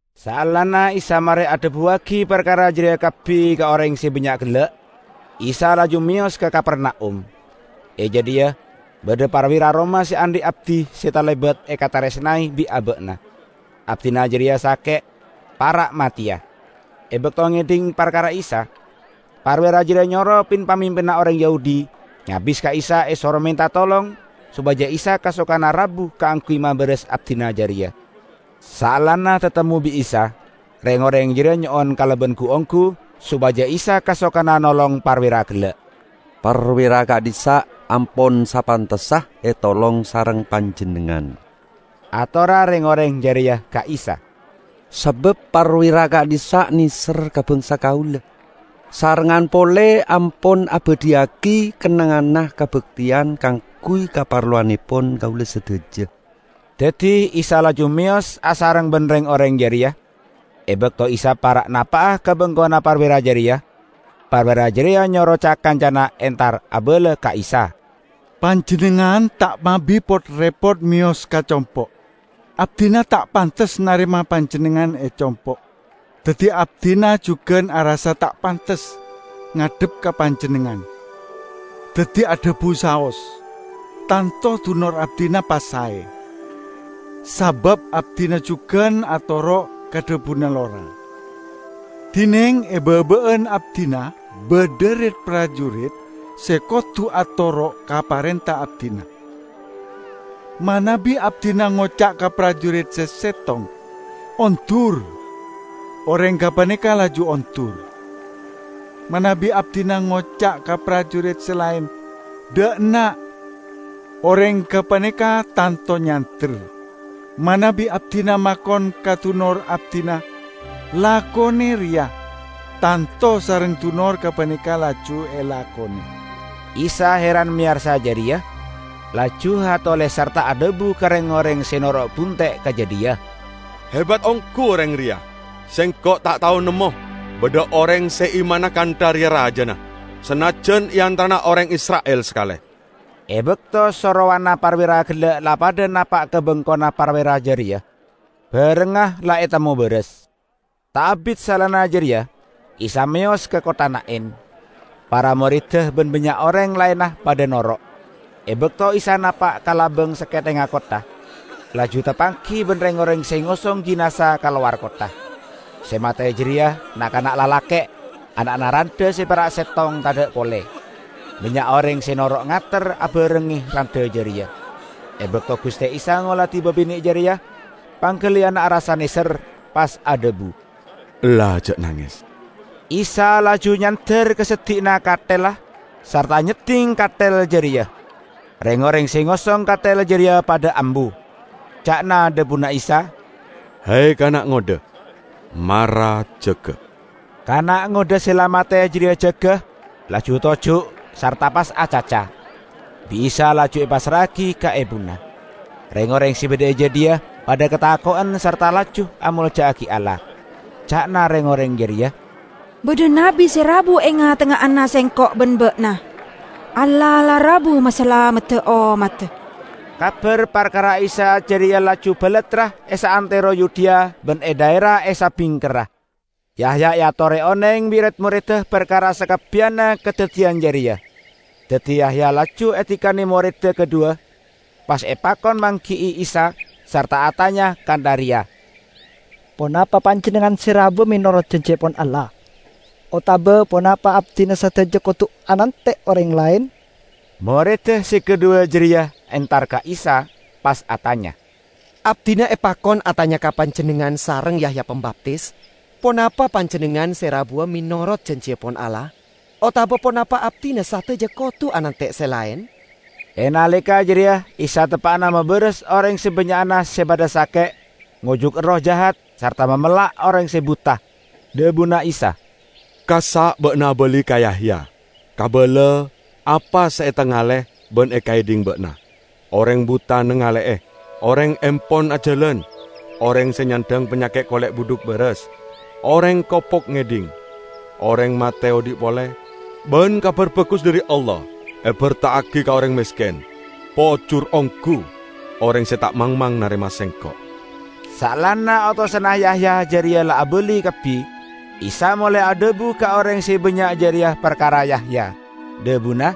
Saellana Isa mare adhabuwagi parkara jareya kabbi ka oreng se bannya' gella', Isa laju meyos ka Kapernaum. E jadhiya badha parwira Roma se andhi' abdi se talebat ekataresnae bi' aba'na. Abdina jareya sake', para' mateya. E bakto ngedhing parkara Isa, parwira jareya nyoro pin-pamimpinna oreng Yahudi nyabis ka Isa esoro menta tolong sopaja Isa kasokana rabu kaangguy mabaras abdina jareya. Saellana tatemmo bi' Isa, reng-oreng jareya nyo'on kalaban gu-onggu sopaja Isa kasokana nolong parwira gella'. "Parwira ka'dhissa' ampon sapantessa etolong sareng Panjennengngan," atorra reng-oreng jareya ka Isa, "sabab parwira ka'dhissa' neser ka bangsa kaula, sarengngan pole ampon abadhiyagi kennengnganna kabakteyan kaangguy kaparlowannepon kaula sadaja." Daddi Isa laju meyos asareng ban reng-oreng jareya. E bakto Isa para' napa'a ka bengkona parwira jareya, parwira jareya nyoro ca-kancana entar abala ka Isa, "Panjennengngan ta' mabi pot-repot meyos ka compo'. Abdina ta' pantes narema Panjennengngan e compo'. Daddi abdina jugan arassa ta' pantes ngadhep ka Panjennengngan. Daddi adhabu saos, tanto dunor abdina pas sae. Sabab abdina jugan atoro' ka dhabuna lora, dineng e baba'an abdina badha rit-parjurit se kodu atoro' ka parenta abdina. Manabi abdina ngoca' ka parjurit se settong, 'Ondur!' oreng gapaneka laju ondur; manabi abdina ngoca' ka parjurit se laen, 'Dha' enna'!' oreng gapaneka tanto nyander. Manabi abdina makon ka dunor abdina, 'Lakone reya!' tanto sareng dunor gapaneka laju elakone." Isa heran meyarsa jareya, laju atole sarta adhabu ka reng-oreng se noro' bunte' ka jadhiya, "Hebat onggu oreng reya. Sengko' ta' tao nemmo badha oreng se imanna kantha reya rajana, sanajjan e antarana oreng Isra'il sakale!" E bakto sorowanna parwira gella' la padha napa' ka bengkona parwira jareya, barengnga la etemmo baras. Ta' abit saellana jareya Isa meyos ka kottha Na'in. Para moredda ban bannya' oreng laenna padha noro'. E bakto Isa napa' ka labang sakethengnga kottha, laju tapanggi ban reng-oreng se ngosong jinaza ka lowar kottha. Se mate jareya na'-kana' lalake', ana'na randha se pera' settong tadha' pole. Bannya' oreng se noro' ngater abarengnge randha jareya. E bakto Guste Isa ngoladi babine' jareya, panggaliyanna arassa neser, pas adhabu, "Ella, ja' nanges!" Isa laju nyander ka seddi'na kathella, sarta nyedding kathel jareya. Reng-oreng se ngosong kathel jareya padha ambu. Ca'na dhabuna Isa, "He, kana' ngodha, mara jaga!" Kana' ngodha se la mate jareya jaga, laju toju' sarta pas acaca. Bi' Isa laju epassra'agi ka ebuna. Reng-oreng se badha e jadhiya padha katako'en sarta laju amolja'agi Allah. Ca'na reng-oreng jareya, "Badha nabbi se rabu e nga'-tengnga'anna sengko' ban ba'na! Allah la rabu masalamedda ommadda!" Kabar parkara Isa jareya laju balattra e saantero Yudea ban e dhaera e sabingkerra. Yahya eatore oneng bi' red-moredda parkara sakabbiyanna kadaddiyan jareya. Daddi Yahya laju adikane moredda kadhuwa, pas epakon manggi'i Isa sarta atanya kantha reya, "Ponapa Panjennengngan se rabuwa menorot janjiepon Allah, otaba ponapa abdina sadaja kodu anante' oreng laen?" Moredda se kadhuwa jareya entar ka Isa, pas atanya, "Abdina epakon atanya ka Panjennengngan sareng Yahya Pambaptis, ponapa Panjennengngan se rabuwa menorot janjiepon Allah, otaba ponapa abdina sadaja kodu anante' se laen?" E naleka jareya Isa teppa'na mabaras oreng sabannya'na se padha sake', ngojuk erroh jahat sarta mamella' oreng se buta. Dhabuna Isa, "Kassa' ba'na abali ka Yahya kabala apa se etangale ban ekaedhing ba'na: oreng buta nangale'e, oreng empon ajalan, oreng se nyandhang panyaket kole' budhuk baras, oreng kopok ngedhing, oreng mate odhi' pole, ban Kabar Bagus dhari Allah eberta'agi ka oreng mesken. Pojur onggu oreng se ta' mangmang narema Sengko'!" Saellana otosanna Yahya jareya la abali kabbi, Isa molae adhabu ka oreng se bannya' jareya parkara Yahya, dhabuna,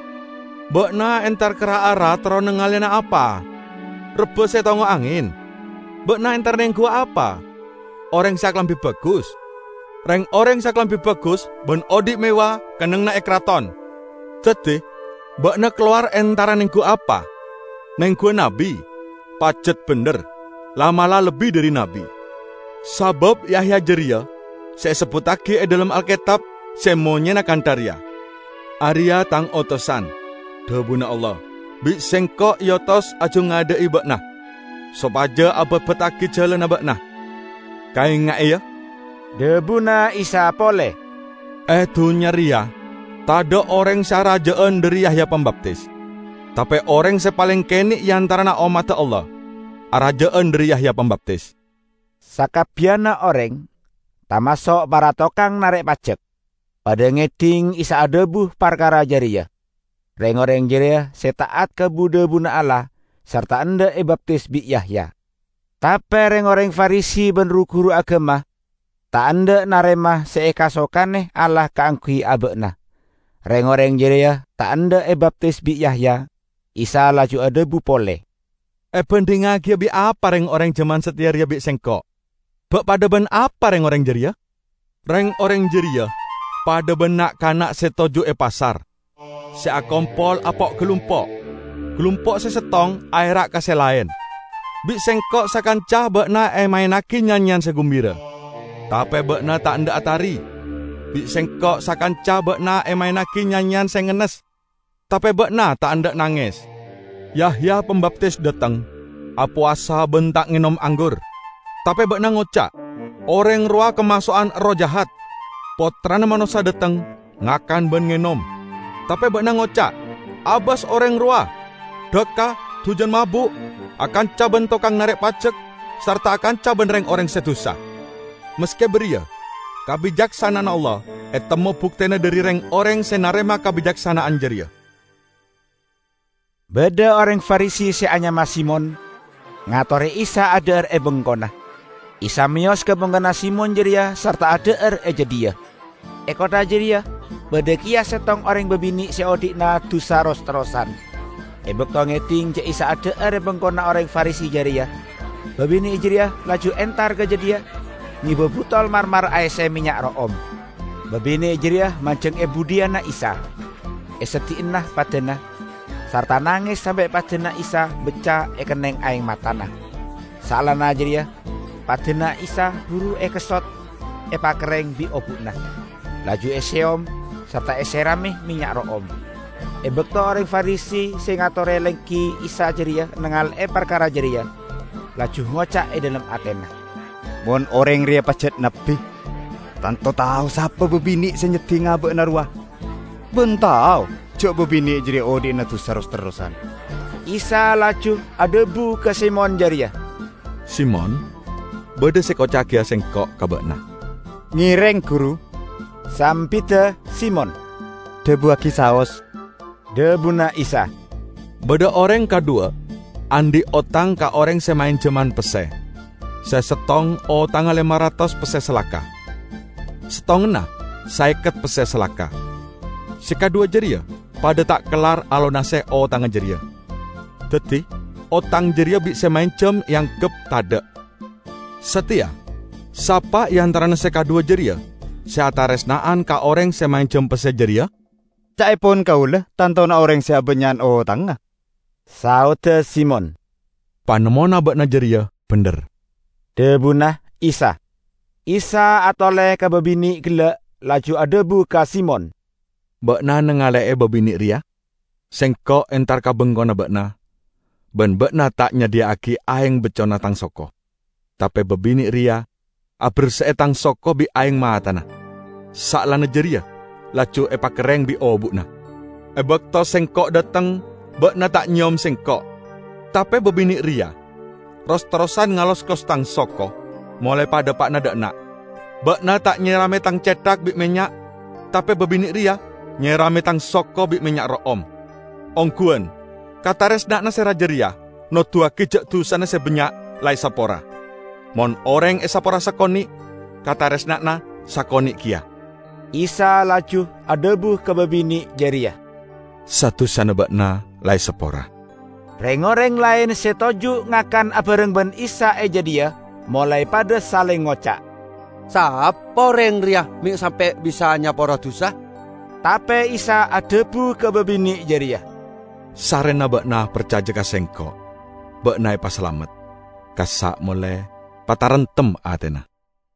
"Ba'na entar ka ra-ara terro nangaleyana apa? Rebba se etongngo' angen? Ba'na entara nenggu apa? Oreng se akalambi bagus? Reng-oreng se akalambi bagus ban odhi' mewah kennengnganna e karaton! Daddi ba'na kalowar entara nenggu apa? Nengguwa nabbi? Pajat bendher, la'-mala' lebbi dhari nabbi. Sabab Yahya jareya se esebbuttagi e dhalem Alketab se monyena kantha reya, 'Areya' Tang otosan,' dhabuna Allah, 'Bi' Sengko' eotos ajangadha'i Ba'na, sopaja ababattagi jalanna Ba'na!' " "Kaenga'e, ya," dhabuna Isa pole, "e dunnya reya tadha' oreng se araja'an dhari Yahya Pambaptis. Tape oreng se paleng kene' e antarana ommadda Allah, araja'an dhari Yahya Pambaptis." Sakabbiyanna oreng -- tamaso' para tokang narek pajek -- padha ngedhing Isa adhabu parkara jareya; reng-oreng jareya se ta'at ka bu-dhabuna Allah sarta endha' ebaptis bi' Yahya. Tape reng-oreng Farisi ban ru-guru agama ta' endha' narema se ekasokane Allah kaangguy aba'na. Reng-oreng jareya ta' endha' ebaptis bi' Yahya. Isa laju adhabu pole, "Ebandhingngagiya bi' apa reng-oreng jaman sateya reya bi' Sengko'? Ba' padha ban apa reng-oreng jareya? Reng-oreng jareya padha ban na'-kana' se toju' e pasar; se akompol apo'-galumpo'. Galumpo' se settong aera' ka se laen, 'Bi' sengko' sakanca ba'na emaennagi nyanyeyan se gumbira, tape ba'na ta' endha' atari! Bi' sengko' sakanca ba'na emaennagi nyanyeyan se ngennes, tape ba'na ta' endha' nanges!' Yahya Pambaptis dhateng -- apowasa ban ta' ngenom anggur -- tape ba'na ngoca', 'Oreng rowa kamaso'an erroh jahat!' Pottrana Manossa dhateng -- ngakan ban ngenom -- tape ba'na ngoca', 'Abas oreng rowa! Dhakka dujan mabu', akanca ban tokang narek pajek sarta akanca ban reng-oreng se dusa.' Maske bariya, kabicaksana'anna Allah etemmo buktena dhari reng-oreng se narema kabicaksana'an jareya." Badha oreng Farisi se anyama Simon, ngatore Isa adha'ar e bengkona; Isa meyos ka bengkona Simon jareya sarta adha'ar e jadhiya. E kottha jareya badha keya settong oreng babine' se odhi'na dusa ros-terrosan. E bakto ngedhing ja' Isa adha'ar e bengkona oreng Farisi jareya, babine' jareya laju entar ka jadhiya ngeba butol marmar aesse mennya' ro'om. Babine' jareya manjeng e budhiyanna Isa, e seddi'anna padana, sarta nanges sampe' padana Isa bacca ekenneng aeng matana. Saellana jareya padana Isa buru ekessot epakerreng bi' obu'na, laju eseyom sarta eserame mennya' ro'om. E bakto oreng Farisi se ngatore lenggi Isa jareya nangale'e parkara jareya, laju ngoca' e dhalem atena, "Mon oreng reya pajat nabbi, tanto tao sapa babine' se nyedding aba'na rowa, ban tao ja' babine' jareya odhi'na dusa ros-terrosan!" Isa laju adhabu ka Simon jareya, "Simon, badha se ekoca'agiya Sengko' ka ba'na." "Ngereng, Guru," sambidda Simon, "dhabuwagi saos." Dhabuna Isa, "Badha oreng kadhuwa andhi' otang ka oreng se maenjaman pesse. Se settong otangnga lema ratos pesse salaka, settonganna saeket pesse salaka. Se kadhuwa jareya padha ta' kellar alonase otangnga jareya, daddi otang jareya bi' se maenjam eanggep tadha'. Sateya, sapa e antarana se kadhuwa jareya se ataresna'an ka oreng se maenjam pesse jareya?" "Ca'epon kaula tantona oreng se abannya'an otangnga!" saodda Simon. "Panemmona ba'na jareya bendher," dhabuna Isa. Isa atole ka babine' gella' laju adhabu ka Simon, "Ba'na nangale'e babine' reya? Sengko' entar ka bengkona ba'na, ban ba'na ta' nyadhiya'agi aeng baccona Tang soko; tape babine' reya aberse'e Tang soko bi' aeng matana, saellana jareya laju epakerreng bi' obu'na. E bakto Sengko' dhateng ba'na ta' nyeyom Sengko', tape babine' reya ros-terrosan ngaloskos Tang soko molae padhapa'na dha' enna'. Ba'na ta' nyerame Tang cethak bi' mennya' tape babine' reya nyerame Tang soko bi' mennya' ro'om. Ongguwan: kataresna'anna se raja reya noduwagi ja' dusana se bannya' la esapora! Mon oreng esapora sakone', kataresna'anna sakone' keya." Isa laju adhabu ka babine' jareya, "Sa-dusana ba'na la esapora." Reng-oreng laen se toju' ngakan abareng ban Isa e jadhiya molae padha saleng ngoca', "Sapa oreng reya me' sampe' bisa nyapora dusa?" Tape Isa adhabu ka babine' jareya, "Sarrena ba'na parcaja ka Sengko', ba'na epasalamet. Kassa' mole, pataremtem atena!"